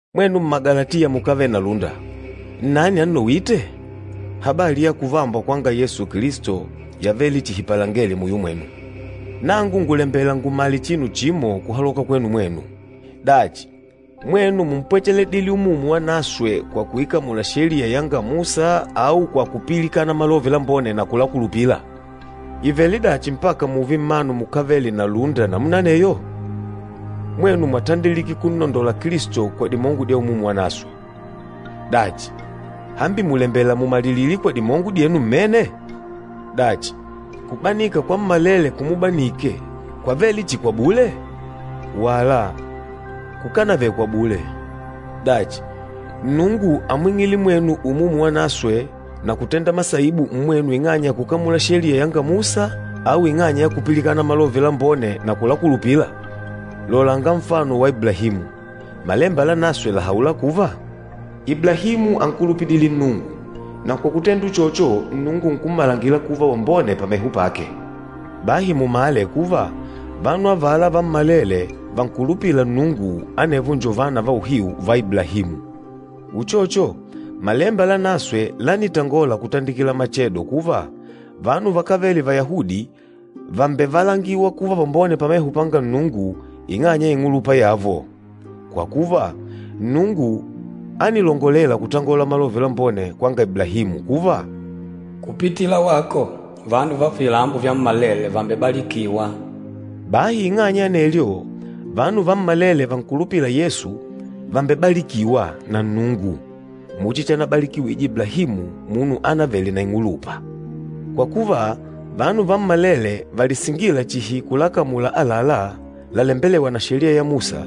Mwenu Mmagalatiya mukávele na lúnda, nnani annowîte? Habali ya kuvambwa kwanga Yesu Kilisto yavele chihi palengele muyo mwenu. Nangu ngùlembela ngumale chinu chimo kuhaloka kwenu mwenu. Dachi, mwenu múmpwecheledile Umumu Wanaswe kwa kuikamula Sheliya yanga Musa au kwa kupilikana Malove Lambone na kulakulupila? Ìvele dachi mpaka mùùve mmanu mukávele na lúnda namuna aneyo? Mwenu mwatandilike kunnondola Kilisto kwa dimongo dya Umumu Wanaswe. Dachi, hambi mùlembela mumalilile kwa dimongo dyenu mmene? Dachi, kubanika kwammalele kumubanike, kwávele chihi kwa bule? Wala, kukánavele kwa bule! Dachi, Nnungu ámwing'ile mwenu Umumu Wanaswe na kutenda masaibu mmwenu ing'anya ya kukamula Sheliya yanga Musa au ing'anya ya kupilikana Malove Lambone na kulakulupila? Lolanga nfano wa Iblahimu. Malemba Lanaswe làhaula kuva, “Iblahimu ánkulupidile Nnungu, na kwa kutenda uchocho Nnungu nkummalangila kuva wambone pameho pake.” Bahi mumale kuva vanu avala vammalele vankulupîla Nnungu, anevo njo vana va uhiu va Iblahimu. Uchocho, Malemba Lanaswe lánitangola kutandikila machedo kuva, vanu vakávele Vayahudi vàmbevalangiwa kuva vambone pameho panga Nnungu ing'anya ya ing'ulupa yavo. Kwa kuva, Nnungu ánilongolela kutangola Malove Lambone kwanga Iblahimu kuva, “Kupitila wako, vanu va vilambo vyammalele vàmbebalikiwá.” Bahi ing'anya ya anelyo, vanu vammalele vankulupîla Yesu vàmbebalikiwa na Nnungu muchi chanabalikiwije Iblahimu, munu ánavele na ing'ulupa. Kwa kuva, vanu vammalele valisingîla chihi kulakamula àlalá lalembelêwa na Sheliya ya Musa,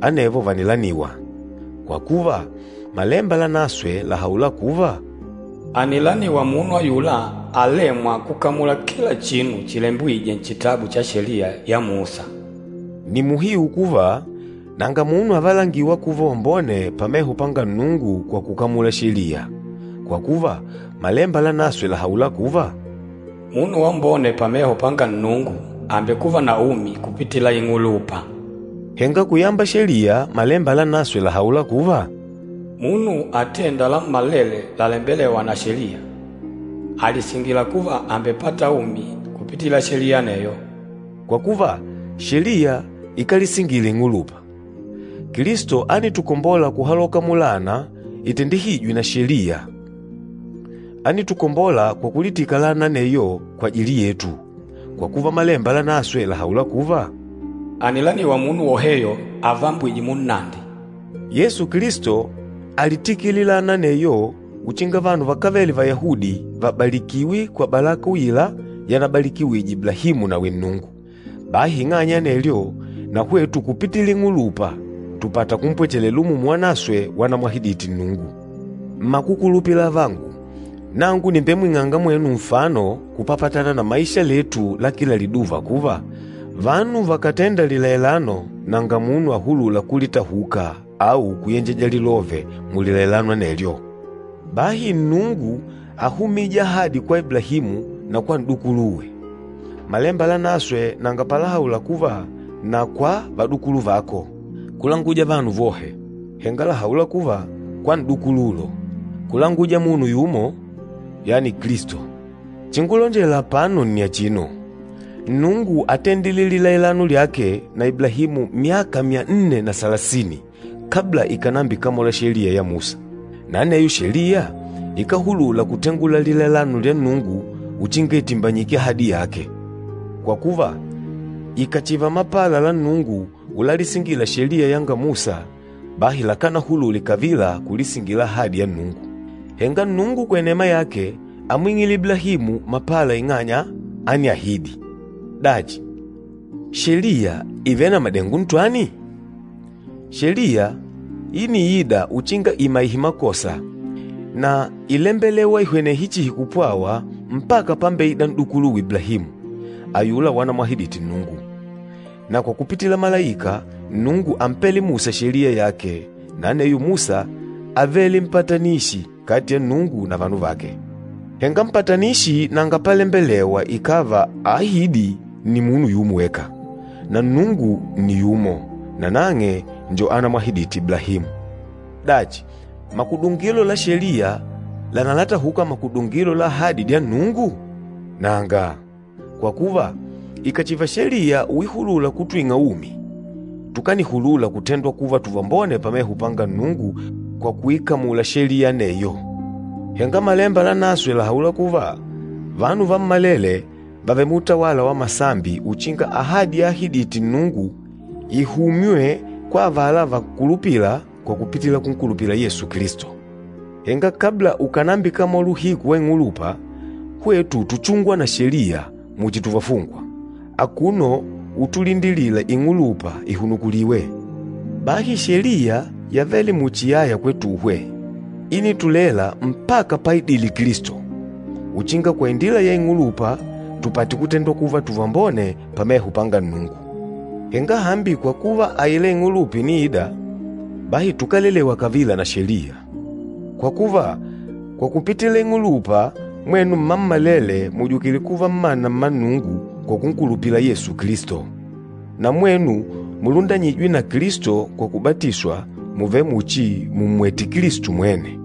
anevo vànilaniwa. Kwa kuva, Malemba Lanaswe làhaula kuva, “Ànilaniwa munu ayula alêmwa kukamula kila chinu chilembwîje nchitabu cha Sheliya ya Musa.” Nni muhiu kuva, nanga munu avalangîwa kuva wambone pameho panga Nnungu kwa kukamula Sheliya, kwa kuva, Malemba Lanaswe làhaula kuva, “Munu wambone pameho panga Nnungu àmbekuva na umi kupitila ing'ulupa.” Henga kuyamba Sheliya, Malemba Lanaswe làhaula kuva, “Munu atênda lammalele lalembelêwa na Sheliya, àlisingila kuva àmbepata umi kupitila Sheliya aneyo.” Kwa kuva, Sheliya ikálisingila ing'ulupa. Kilisto ánitukombola kuhaloka mulaana itendihîjwe na Sheliya. Ánitukombola kwa kulitika laana aneyo kwajili yetu, kwa kuva Malemba Lanaswe làhaula kuva, “Ànilaniwa munu woheyo avambwîje munnandi.” Yesu Kilisto álitikile laana aneyo uchinga vanu vakávele Vayahudi vabalikiwe kwa balaka uila yanabalikiwije Iblahimu nawi Nnungu. Bahi ing'anya ya anelyo, na hwetu kupitila ing'ulupa tùpata kumpwechelela Umumu Wanaswe wanamwahidite Nnungu. Mmakukulupila avangu, nangu nìmbemwing'anga mwenu nfano kupapatana na maisha letu la kila liduva kuva, vanu vakàtenda lilailano nanga munu ahulûla kulitahuka au kuyenjeja lilove mulilailano anelyo. Bahi Nnungu áhumije ahadi kwa Iblahimu na kwa n'dukuluwe. Malemba Lanaswe nanga palahaula kuva, “na kwa vadukulu vako,” kulanguja vanu vohe. Henga làhaula kuva, “kwa n'dukululo,” kulanguja munu yumo, yani Kilisto. Chingulonjela apano nni achino, Nnungu átendile lilailano lyake na Iblahimu myaka myanne na salasini, kabla ikànambikamola Sheliya ya Musa. Na aneyo Sheliya ikáhulula kutengula lilailano lya Nnungu uchinga itimbanyike ahadi yake. Kwa kuva, ikàchiva mapala la Nnungu ulalisingila Sheliya yanga Musa, bahi lakánahulule kavila kulisingila ahadi ya Nnungu. Henga Nnungu kwa inema yake ámwing'ile Iblahimu mapala ing'anya ániahidi. Dachi, Sheliya ìvele na madengo ntwani? Sheliya íniida uchinga imaihe makosa, na ílembelewa ihwenehe chihi kupwawa mpaka pámbeìdà n'dukuluwe Iblahimu, ayula wanamwahidite Nnungu. Na kwa kupitila malaika, Nnungu ámpele Musa Sheliya yake, na aneyo Musa ávele mpatanishi kati ya Nnungu na vanu vake. Henga mpatanissi nanga palembelewa ikàva aahîdi nni munu yumo weka, na Nnungu nni yumo, nanang'e njo anamwahidite Iblahimu. Dachi, makudungilo la Sheliya lanalatahuka makudungilo la ahadi dya Nnungu? Nanga! Kwa kuva, ikàchiva Sheliya uihulula kutwing'a umi, tukanihulula kutendwa kuva tuvambone pameho panga Nnungu kwa kuikamula Sheliya aneyo. Henga Malemba Lanaswe làhaula kuva, vanu vammalele vàvele muutawala wa masambi uchinga ahadi yaahidite Nnungu ihumywe kwa avala vankulupîla kwa kupitila kunkulupila Yesu Kilisto. Henga kabla ukànambikamola uhiku wa ing'ulupa, hwetu túchungwa na Sheliya muchi tuvafungwa, akuno utulindilila ing'ulupa ihunukuliwe. Bahi Sheliya yavele muchi yaya kwetuhwe, ínitulela mpaka páidìlè Kilisto, uchinga kwa indila ya ing'ulupa tupate kutendwa kuva tuvambone pameho panga Nnungu. Henga hambi kwa kuva aila ing'ulupa ìniida, bahi tukálelewa kavila na Sheliya. Kwa kuva, kwa kupitila ing'ulupa, mwenu mmammalele mùjukile kuva mmana mma Nnungu kwa kunkulupila Yesu Kilisto. Na mwenu mulundanyîjwe na Kilisto kwa kubatiswa, mùvele muchi mùmmwete Kilisto mwene.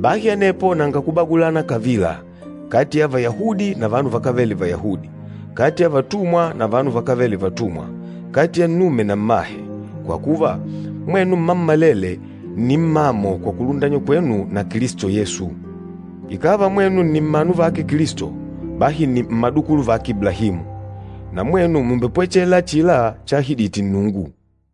Bahi anepo nanga kubagulana kavila kati ya Vayahudi na vanu vakávele Vayahudi, kati ya vatumwa na vanu vakávele vatumwa, kati ya nnume na mmahe, kwa kuva, mwenu mmammalele nni ummamo kwa kulundanywa kwenu na Kilisto Yesu. Ikàva mwenu nni mmanu vake Kilisto, bahi nni mmadukulu vake Iblahimu, na mwenu mùmbepwechela achila chaahidite Nnungu.